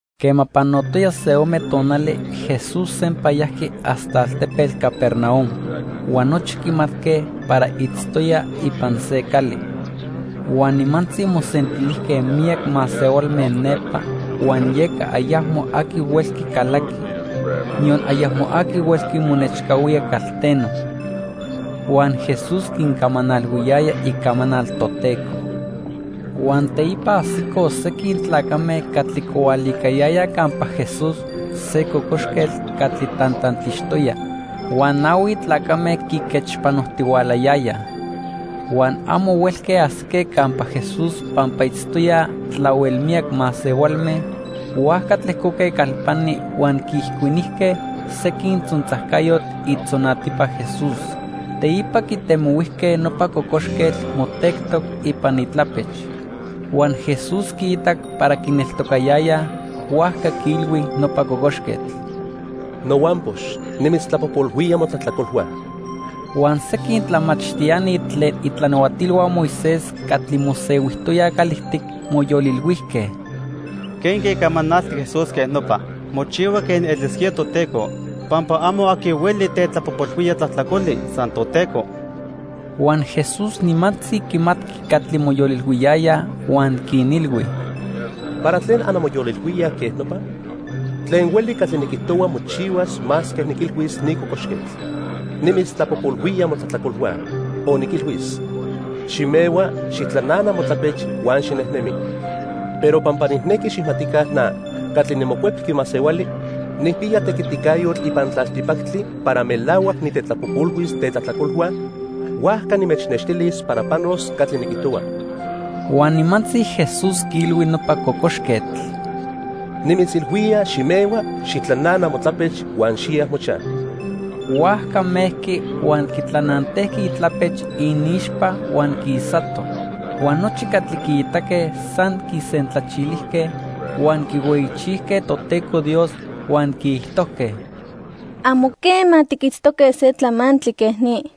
Quema panotoya se ome tonali, Jesús sempa yajqui hasta altepetl Capernaum, huan nochi quimatque para itztoya ipan se cali. Huan nimantzi mosentilijque miyac masehualme nepa huan yeca ayacmo aqui huelqui calaqui, niyon ayacmo aqui huelqui monechcahuía calteno. Huan Jesús quincamanalhuiyaya icamanal Toteco. Huan teipa ajsicoj sequin tlacame catli quihualicayayaj campa Jesús se cocoxquetl catli tantantixtoya. Huan nahui tlacame quiquechpanojtihualayayaj. Huan amo huelque ajsique campa Jesús pampa itztoyaj tlahuel miyac masehualme, huajca tlejcoque calpani huan quiijcuinijque sequin tzontzajcayotl itzonatipa Jesús. Teipa quitemohuijque nopa cocoxquetl motectoc ipan itlapech. Huan Jesús quiitac para quineltocayayaj, huajca quiilhui nopa cocoxquetl: —Nohuampox nimitztlapojpolhuía motlajtlacolhua. Huan sequin tlamachtiani tlen itlanahuatilhua Moisés catli mosehuijtoyaj calijtic moyolilhuijque: "¿Quenque camanalti Jesús quej nopa? Mochihua quen elisquía Toteco, pampa amo aqui hueli tetlapojpolhuía tlajtlacoli, san Toteco." Huan Jesús nimantzi quimatqui catli moyolilhuiyayaj huan quinilhui: —¿Para tlen anmoyolilhuíaj quej nopa? Tlen hueli catli niquijtohua mochihuas masque niquilhuis ni cocoxquetl: 'Nimitztlapojpolhuía motlajtlacolhua', o niquilhuis: 'Ximehua, xijtlanana motlapech huan xinejnemi.' Pero pampa nijnequi xijmatica na, catli niMocuepqui Masehuali, nijpiya tequiticayotl ipan tlaltipactli para melahuac nitetlapojpolhuis tetlajtlacolhua, huajca nimechnextilis para panos catli niquijtohua. Huan nimantzi Jesús quiilhui nopa cocoxquetl: —Nimitzilhuía, ximehua, xijtlanana motlapech huan xiya mochaj. Huajca mejqui huan quitlanantejqui itlapech iniixpa huan quisato. Huan nochi catli quiitaque san quisentlachilijque huan quihueyichijque Toteco Dios huan quiijtojque: —Amo quema tiquitztoque se tlamantli quej ni.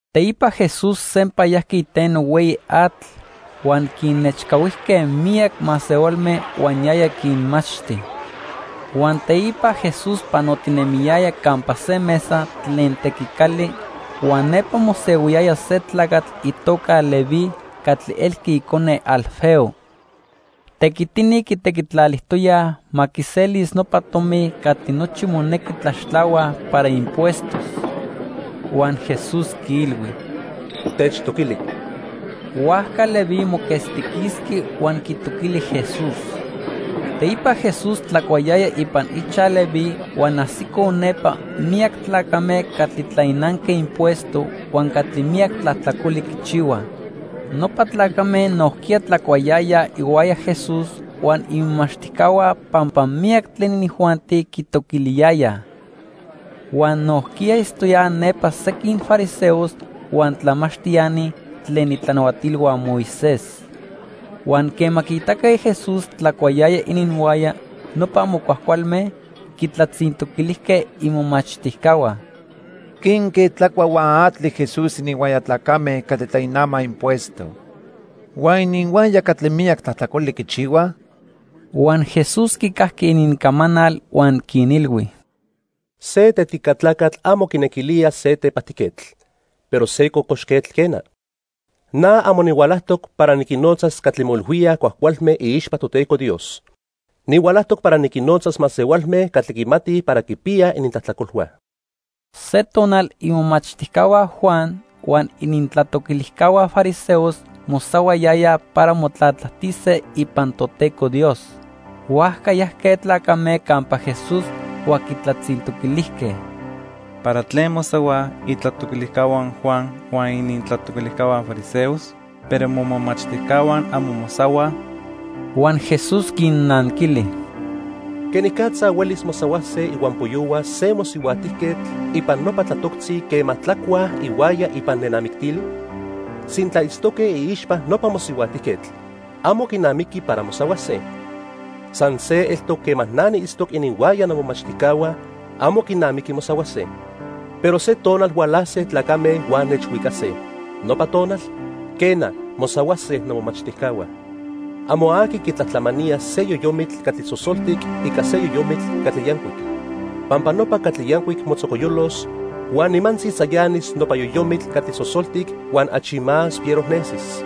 Teipa Jesús sempa yajqui iteno hueyi atl, huan quinechcahuijque miyac masehualme huan yaya quinmachti. Huan teipa Jesús panotinemiyaya campa se mesa tlen tequicali, huan nepa mosehuiyaya se tlacatl itoca Leví catli elqui icone Alfeo. Tequitini quitequitlalijtoyaj ma quiselis nopa tomi catli nochi monequi tlaxtlahuaj para impuestos. Huan Jesús quiilhui: —Techtoquili. Huajca Leví moquetztiquisqui huan quitoquili Jesús. Teipa Jesús tlacuayaya ipan ichaj Leví huan ajsicoj nepa miyac tlacame catli tlainanque impuesto huan catli miyac tlajtlacoli quichihuaj. Nopa tlacame nojquiya tlacuayayaj ihuaya Jesús huan imomachtijcahua pampa miyac tlen inijuanti quitoquiliyayaj. Huan nojquiya itztoyaj nepa sequin fariseos huan tlamachtiani tlen itlanahuatilhua Moisés. Huan quema quiitaque Jesús tlacuayaya ininhuaya nopa amo cuajcualme, quintlatzintoquilijque imomachtijcahua: —¿Quenque tlacua huan atli Jesús ininhuaya tlacame catli tlainamaj impuesto huan ininhuaya catli miyac tlajtlacoli quichihuaj? Huan Jesús quicajqui inincamanal huan quinilhui: —Se tetica tlacatl amo quinequilía se tepajtijquetl, pero se cocoxquetl, quena. Na amo nihualajtoc para niquinnotzas catli moilhuíaj cuajcualme iixpa Toteco Dios. Nihualajtoc para niquinnotzas masehualme catli quimatij para quipiyaj inintlajtlacolhua. Se tonal imomachtijcahua Juan huan inintlatoquilijcahua fariseos mosahuayayaj para motlatlajtise ipan Toteco Dios. Huajca yajque tlacame campa Jesús huan quitlatzintoquilijque: —¿Para tlen mosahuaj itlatoquilijcahua Juan huan inintlatoquilijcahua fariseos, pero momomachtijcahua amo mosahuaj? Huan Jesús quinnanquili: —¿Quenicatza huelis mosahuase ihuampoyohua se mosihuajtijquetl ipan nopa tlatoctzi quema tlacuaj ihuaya ipan nenamictili? Sintla itztoque iixpa nopa mosihuajtijquetl, amo quinamiqui para mosahuase. San se eltoc quema na niitztoc ininhuaya nomomachtijcahua, amo quinamiqui mosahuase. Pero se tonal hualase tlacame huan nechhuicase. Nopa tonal, quena, mosahuase nomomachtijcahua. 'Amo aqui quitlatlamanía se yoyomitl catli sosoltic ica se yoyomitl catli yancuic, pampa nopa catli yancuic motzocoyolos huan nimantzi tzayanis nopa yoyomitl catli sosoltic huan achi más fiero nesis.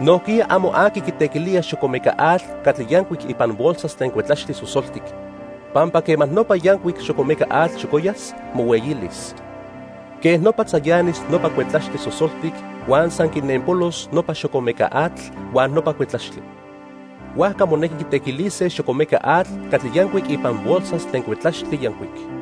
Nojquiya amo aqui quitequilía xocomeca atl catli yancuic ipan bolsas tlen cuetlaxtli sosoltic, pampa quema nopa yancuic xocomeca atl xocoyas, mohueyilis. Quej nopa tzayanis nopa cuetlaxtli sosoltic huan san quinenpolos nopa xocomeca atl huan nopa cuetlaxtli. Huajca monequi quitequilise xocomeca atl catli yancuic ipan bolsas tlen cuetlaxtli yancuic.'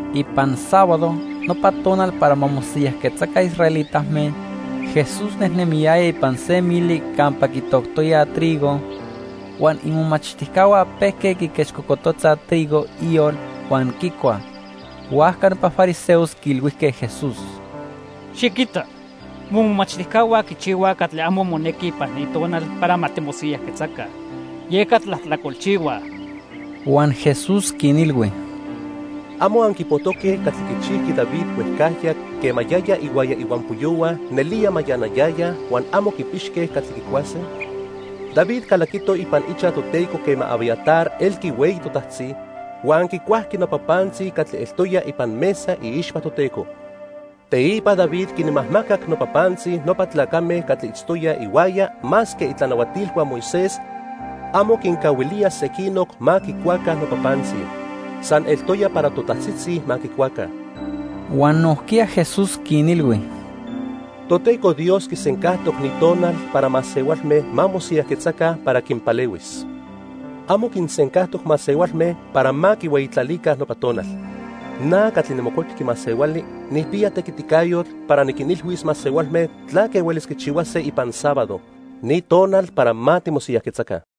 Ipan sábado, nopa tonal para ma mosiyajquetzaca israelitame, Jesús nejnemiyaya ipan se mili campa quitoctoyaj trigo, huan imomachtijcahua pejque quiquechcocototzaj trigo iyol huan quicuaj. Huajca nopa fariseos quiilhuijque Jesús: —Xiquita, momomachtijcahua quichihuaj catli amo monequi ipan ni tonal para ma timosiyajquetzaca, yeca tlajtlacolchihuaj. Huan Jesús quinilhui: —¿Amo anquipojtoque catli quichijqui David huejcajya quema yaya ihuaya ihuampoyohua nelía mayanayayaj huan amo quipixque catli quicuase? David calaquito ipan ichaj Toteco quema Abiatar elqui hueyi totajtzi, huan quicuajqui nopa pantzi catli eltoya ipan mesa iixpa Toteco. Teipa David quinmajmacac nopa pantzi nopa tlacame catli itztoyaj ihuaya masque itlanahuatilhua Moisés amo quincahuilíaj sequinoc ma quicuaca nopa pantzi. San eltoya para totajtzitzi ma quicuaca. Huan nojquiya Jesús quinilhui: —Toteco Dios quisencajtoc ni tonal para masehualme ma mosiyajquetzaca para quinpalehuis. Amo quinsencajtoc masehualme para ma quihueyitlalica nopa tonal. Na, catli niMocuepqui Masehuali, nijpiya tequiticayotl para niquinilhuis masehualme tlaque huelis quichihuase ipan sábado, ni tonal para ma timosiyajquetzaca.